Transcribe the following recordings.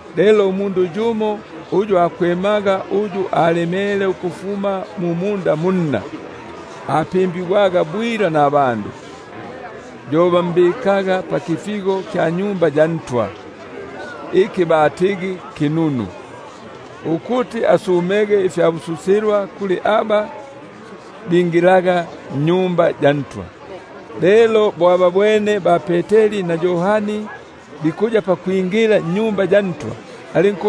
Lelo umundu yumo uyu akwemaga ukufuma mu munda munna, apimbigwe nabandu, yo bambikaga bwila pakifigo kya Tempeli iki batigi kinunu, ukuti asumege ifyabususilwa kuli aba bingilaga mwa Tempeli. Lelo bo ababwene ba-Peteri na Yohani bikuya pakwingila mwa Tempeli, alinku-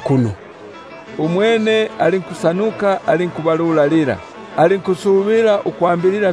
kuno. Umwene alinkubalulalila, alinkusubila ukwambilila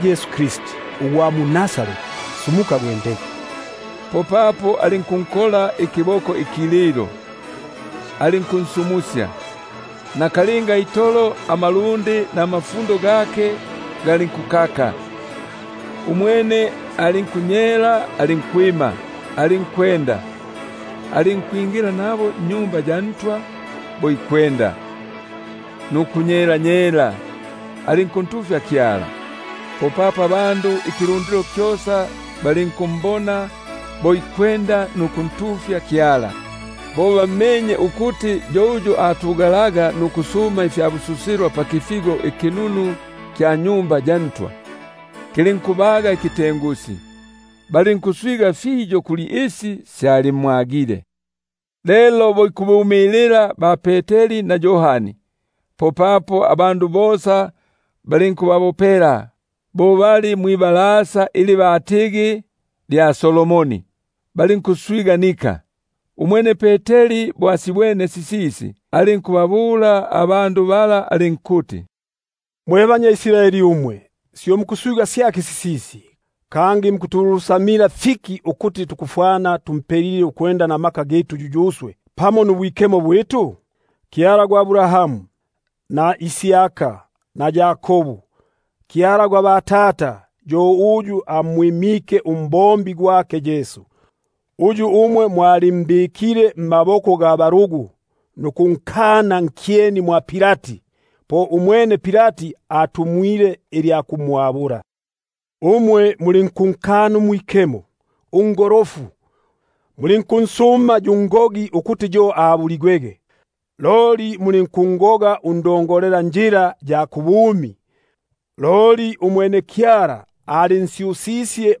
Yesu Kristi ugwa mu-Nazareti, sumuka, gwendege. Popapo alinkunkola ikiboko ikililo, alinkunsumusya; nakalinga itolo injayo nutupungunyo twake tulinkukaka. Umwene alinkunyela alinkwima, alinkwenda; alinkwingila nabo mwa Tempeli bo ikwenda nukunyela, alinkuntufya Kyala. Popapo abandu ikilundilo kyosa balinkumbona bo ikwenda nukuntufya Kyala. Balinkummanya ukuti yo uyu atugalaga nukusuma ifyabususilwa pakifigo ikinunu kya Tempeli; lulinkubaga ikitengusi, balinkuswiganika kuli isi syalimwagile. Lelo bo ikubumilila ba-Peteri na Yohani, popapo abandu bosa balinkubabopela mwibalasa ili batigi lya Solomoni, balinkuswiganika. Umwene Peteri bo asibwene sisisi, alinkubabula alinkuti: Mwe banyambala mwe baIsraeli, syo mukusiswiga syaki sisisi, kangi mukutulusamila fiki ukuti tufwene tumpelile ukwenda mmaka gitu yuyuswe, nukuntila Kyala kwitu? Kyala gwa Abrahamu na Isaka na Yakobu, Kyala gwa batata, yo amwimike umbombi gwake Yesu, uyu umwe mwalimbikile mmaboko ga balugu, nukunkana nkyeni mwa Pilati, bo umwene alongile ilya kumwabula. Umwe mulinkunkana uMwikemo, uNgolofu, mulinkunsuma yu ngogi; loli mulinkungoga uNdongolelanjila ya kubumi, uyu Kyala ansyusisye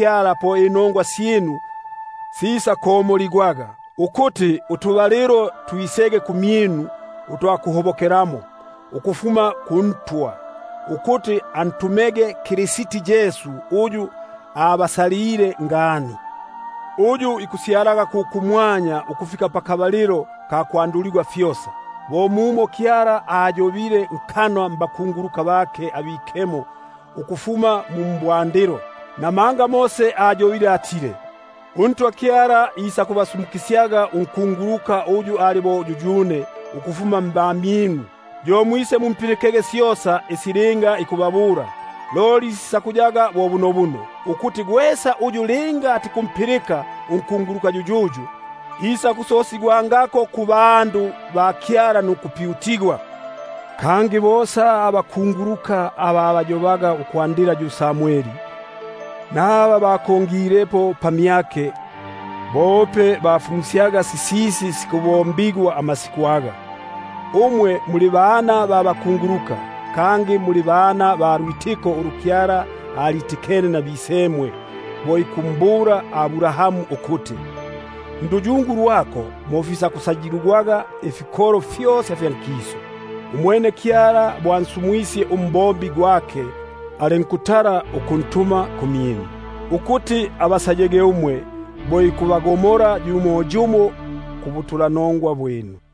po inongwa syinu sisakomoligwaga; ukuti twisege utubalilo twa kuhobokelamo ukufuma kuNtwa, ukuti antumege Kristi Yesu uyu abasalile ngani; uyu ikya kumwanya fikuti kimwambililege ukufika pakabalilo ka kwanduligwa fyosa, bo mumo Kyala ayobile nkanwa mbakunguluka bake abikemo ukufuma mu mbwandilo. Mose ayobile atile: UNtwa Kyala isakuba sumukisyaga unkunguluka uyu ali bo yuyune mbamyinu muno; yo mwisemumpilikege syosa isi linga ikubabula. Loli sisakuyaga bo bunobuno, ukuti gwesa uyu linga atikumpilika unkunguluka yuyuyu, isakupyutigwaga nkikolo kyake. Kangi bosa abakunguluka aba abayobaga ukufuma pa Samweli, naba bakongilepo pamyake, bope bagafumusyaga amasiku gagaga. Umwe muli bana ba bakunguluka, kangi muli bana ba lwitikano ulu Kyala alitikene nabisemwe bo ikumbula Abrahamu ukuti: Nduyungu lwako mo fisakusayiligwaga ifikolo fyosa fya nkisu. Umwene Kyala bo ansumwisye umbombi gwake, alinkutala ukuntuma kumyinu, ukuti abasaye bo ikubagomola yumo yumo kumbibi syinu.